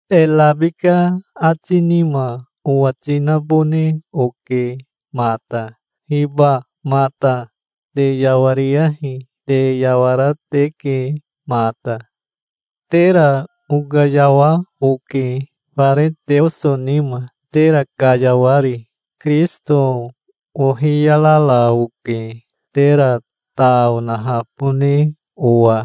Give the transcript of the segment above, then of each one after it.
E rabika ati nima owati nabone oke mata. Hiba mata, te yawariyahi. Te yawara teke mata. Tera okayawa oke, fare Teoso nima, tera kayawari. Kirisito ohiyarara oke, tera ta onahabone owa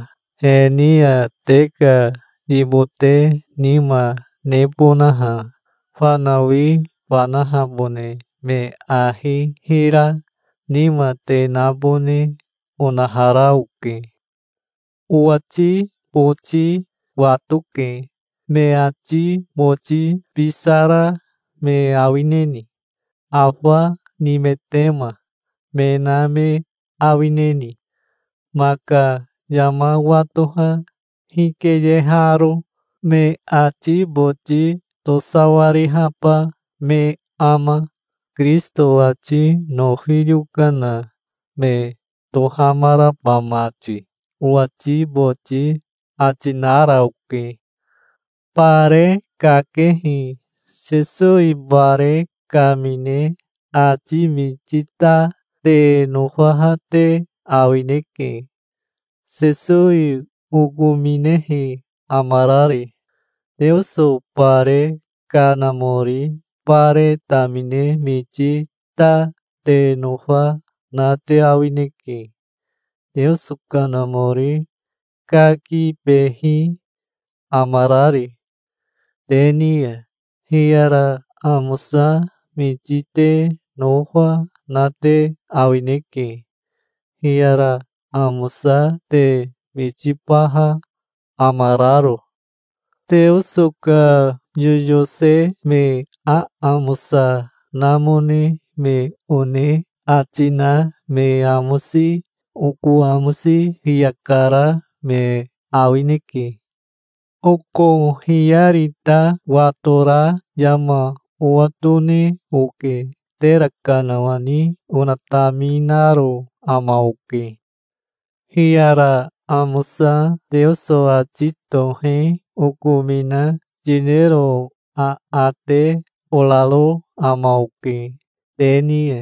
he ni ya, te ka yibote nima nebonaha. Fanawi fanahabone me ahi hira nima te nabone onahara oke. Owati boti watoke. "Me ati boti bisara me awineni? Afa nimetema me na me awineni, maka yama watoha hikeyeharo? Me ati boti tosawarihaba me ama, Kirisito ati nofi yokana me tohamaraba mati?" owati boti ati nara oke. Bare kakehi Sesowi bare kamine ati miti ta te nofaha te awineke, Sesowi okominehi amarari. Teoso bare kanamori bare tamine miti ta te nofa na te awineke, Teoso Kanamori kakibehi amarari te ni ya. Hiyara amosa miti te nofa na te awineke, hiyara amosa te mitibaha amararo. Teoso ka yoyose me aamosa namone me one ati na me amosi oko amosi fiya kara me awineke. Oko hiyari ta watora yama owatone oke. Tera kanawani onataminaro ama oke. Hiyara amosa Teoso ati tohe okomina yinero aate oraro ama oke te ni ya.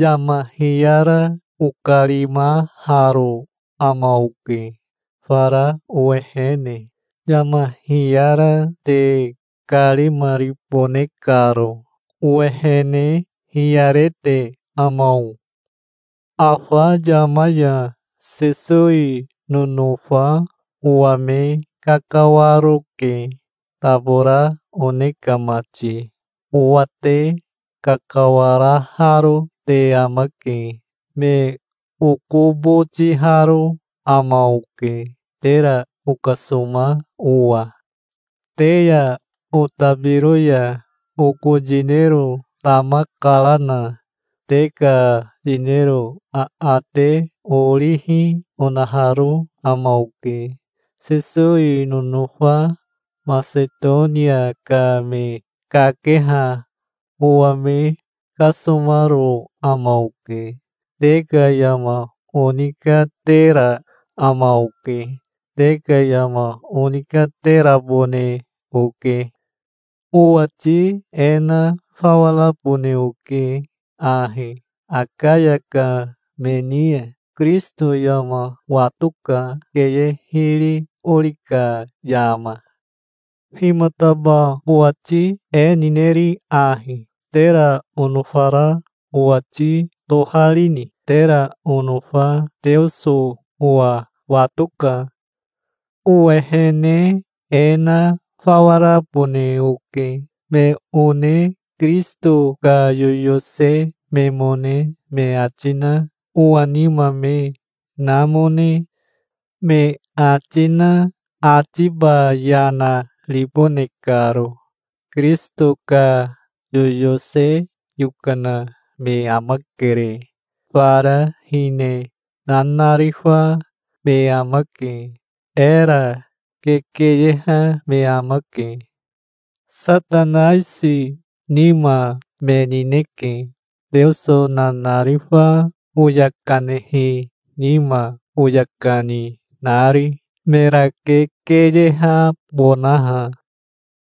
Yama hiyara okarimaharo ama oke fara owehene, yama hiyara te karimaribone karo. Owehene hiyarete ama o? Afa yama ya Sesowi nonofa owa me kakawaroke, tabora one ka mati. Owa te kakawaraharo te amake. Me okobotiharo ama oke, tera okasoma owa. Te ya otabiro ya oko yinero tama karana te ka yinero aate orihi onaharo ama oke. Sesowi nonofa Masetonia ka me kakeha owa me kasomaro ama oke. Te ka yama onikatera ama oke. Te ka yama onikaterabone oke. Owati e na fawa rabone oke ahi Akaya ka me ni ya. Kirisito yama watoka, keye hiri ori ka yama. Himataba owati e nineri ahi? Tera onofara owati toharini? Tera onofa Teoso owa watoka. Owehene e na fawa rabone oke, me one Kirisito ka yoyose memone me ati na owa nima me namone me ati na atiba yana ribone karo. Kirisito ka yoyose yokana me amakere. Fara hine nanarifa me amake. Era kekeyeha me amake. Satanaisi nima me nineke, Teoso nanarifa oya kanehi nima oya kani nari, mera kekeyehabonaha.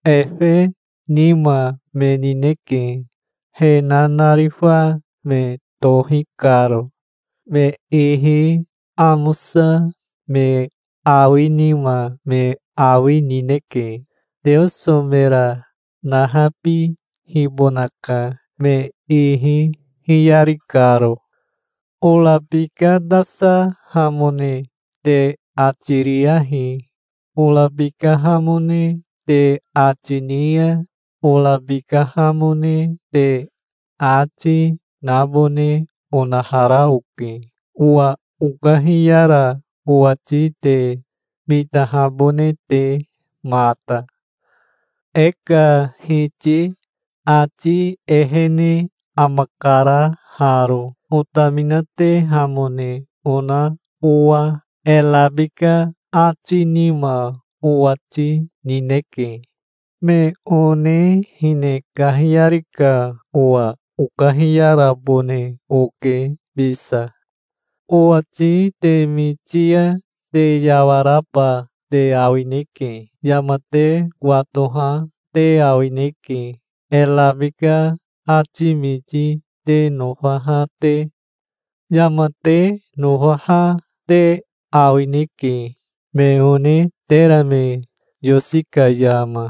Efe nima me nineke, he nanarifa me tohi karo. Me ihi amosa me awi nima me awi nineke. Teoso mera nahabihibonaka, me ihi hiyari karo. Orabikatasahamone te ati riyahi. Orabikahamone te ati ni ya, orabikahamone te ati, nabone onahara oke, owa okahiyara owati te mitahabone te mata. E ka Hiti ati ehene amakara haro, otaminatehamone ona owa. E rabika ati nima owati nineke. Me one hine kahiyari ka owa okahiyarabone oke bisa. Owati te miti ya te yawaraba te awineke. Yama te watoha te awineke, e rabika ati miti te nofaha te. Yama te nofaha te awineke, me one tera me yosi ka yama,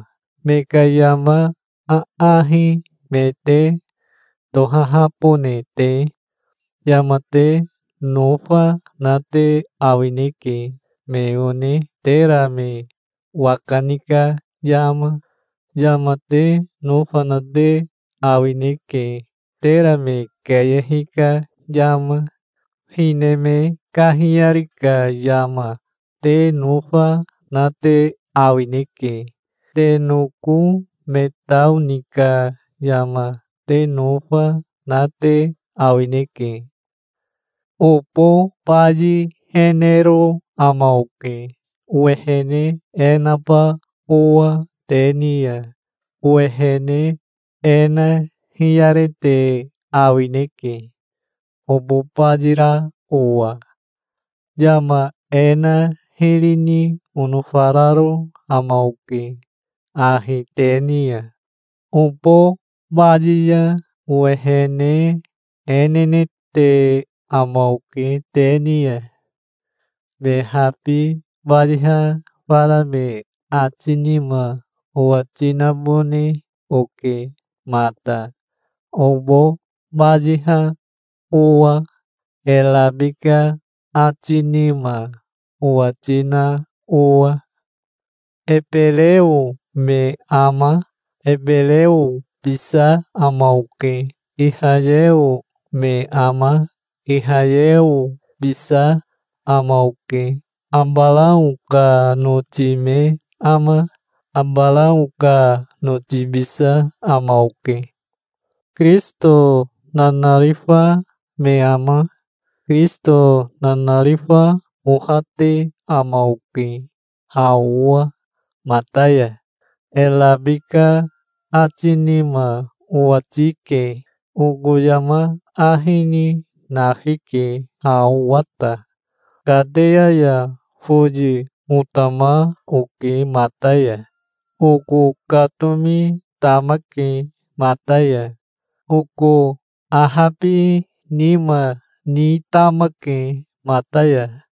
me ka yama aahi me te tohahabone te. Yama te nofa na te awineke, me one tera me waka ni ka yama. Yama te nofa na te awineke, tera me keyehi ka yama. Hine me kahiyari ka yama te nofa na te awineke. Te noko me tao ni ka yama te nofa na te awineke. Obo bayihenero ama oke, owehene e naba owa te ni ya. Owehene e na hiyarete awineke obo bayira owa. Yama e na hiri ni onofararo ama oke ahi te ni ya. Obo bayi ya owehene e nenete ama oke te ni ya. Me habi bayiha fara me ati nima owati nabone oke mata, obo bayiha owa, e rabika ati nima owati na owa. Ebereo me ama? Ebereobisa ama oke. Ihayeo me ama? Ihayeobisa ama oke. Abarao ka noti me ama? Abarao ka notibisa ama oke. Kirisito nanarifa me ama? Kirisito nanarifa ohate ama oke ha owa mata ya. E rabika ati nima owati ke. Oko yama ahi ni nafike ha owa ta. Kateya ya foyi otama oke mata ya. Oko katomi tamake mata ya. Oko ahabinima ni tamake mata ya.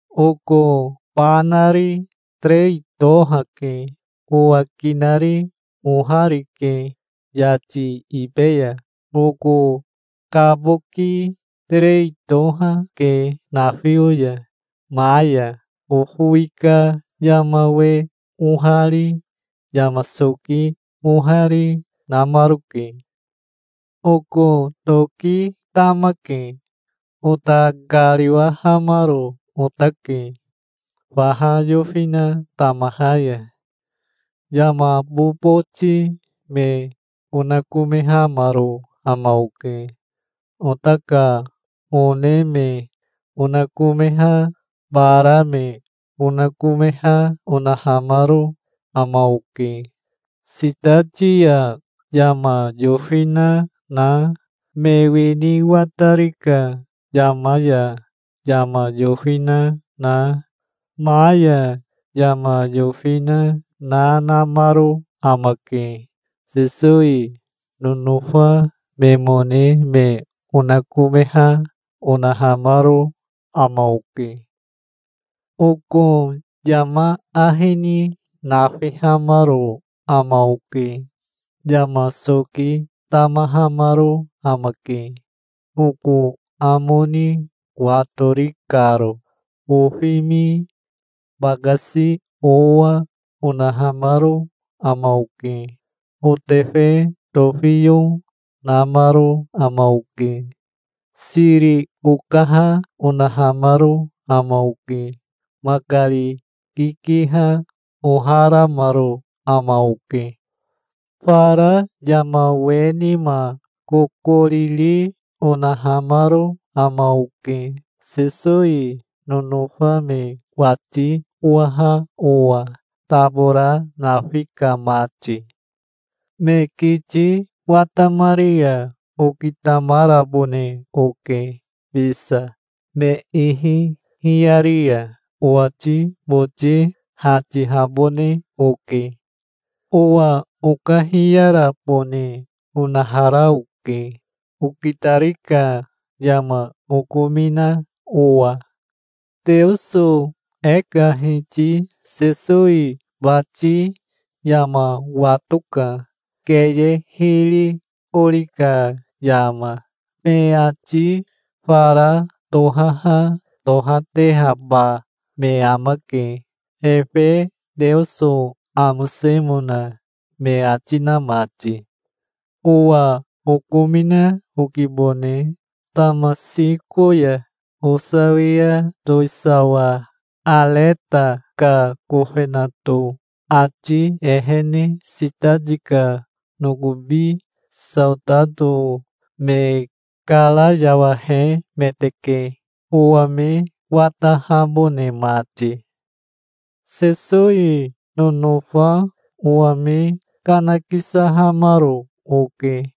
Oko ba nari terei toha, ke. Owa kinari ohari, ke yati ibe ya. Oko kaboki terei toha, ke nafio ya. Ma ya ofowi ka yama we ohari, yama soki ohari, namaroke. Oko toki tamake. Ota kariwahamaro otake faha yofina tamaha ya. Yama boboti me onakomehamaro ama oke. Ota ka one me onakomeha, bara me onakomeha onahamaro ama oke. Sitati ya yama yofina na, me wini watari ka yama ya yama yofina na, ma ya yama yofina na namaro amake. Sesowi nonofa memone me onakomeha onahamaro ama oke. Oko yama ahi ni nafihamaro ama oke. Yama soki tamahamaro amake, oko amo ni watori karo. Ofimi, bakasi owa onahamaro ama oke. Otefe tofiyo namaro ama oke. Siri okaha onahamaro ama oke. Makari kikiha oharamaro ama oke. Fara yama we nima kokoriri, onahamaro ama oke, Sesowi nonofa me wati owaha owa, tabora nafi ka mati. Me kiti watamari ya okitamarabone oke bisa. Me ihi hiyari ya owati boti hatihabone oke. Owa okahiyarabone onahara oke, okitari ka yama okomina owa. Teoso e ka Hiti Sesowi bati yama watoka, keye hiri ori ka yama. Me ati fara tohaha tohatehaba me amake, efe Teoso amosemona me ati na mati. Owa okomina okibone. Tamasiko ya osawia towisawa Areta ka kofenato ati ehene sitati ka nokobi saotato me karayawahemeteke, owa me watahabone mati. Sesowi nonofa owa me kanakisahamaro oke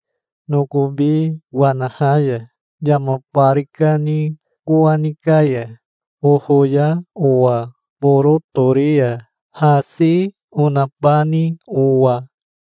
nokobi wanaha ya, yama bari kani kowani ka ya, ofoya owa boro tori ya, hasi onabani owa.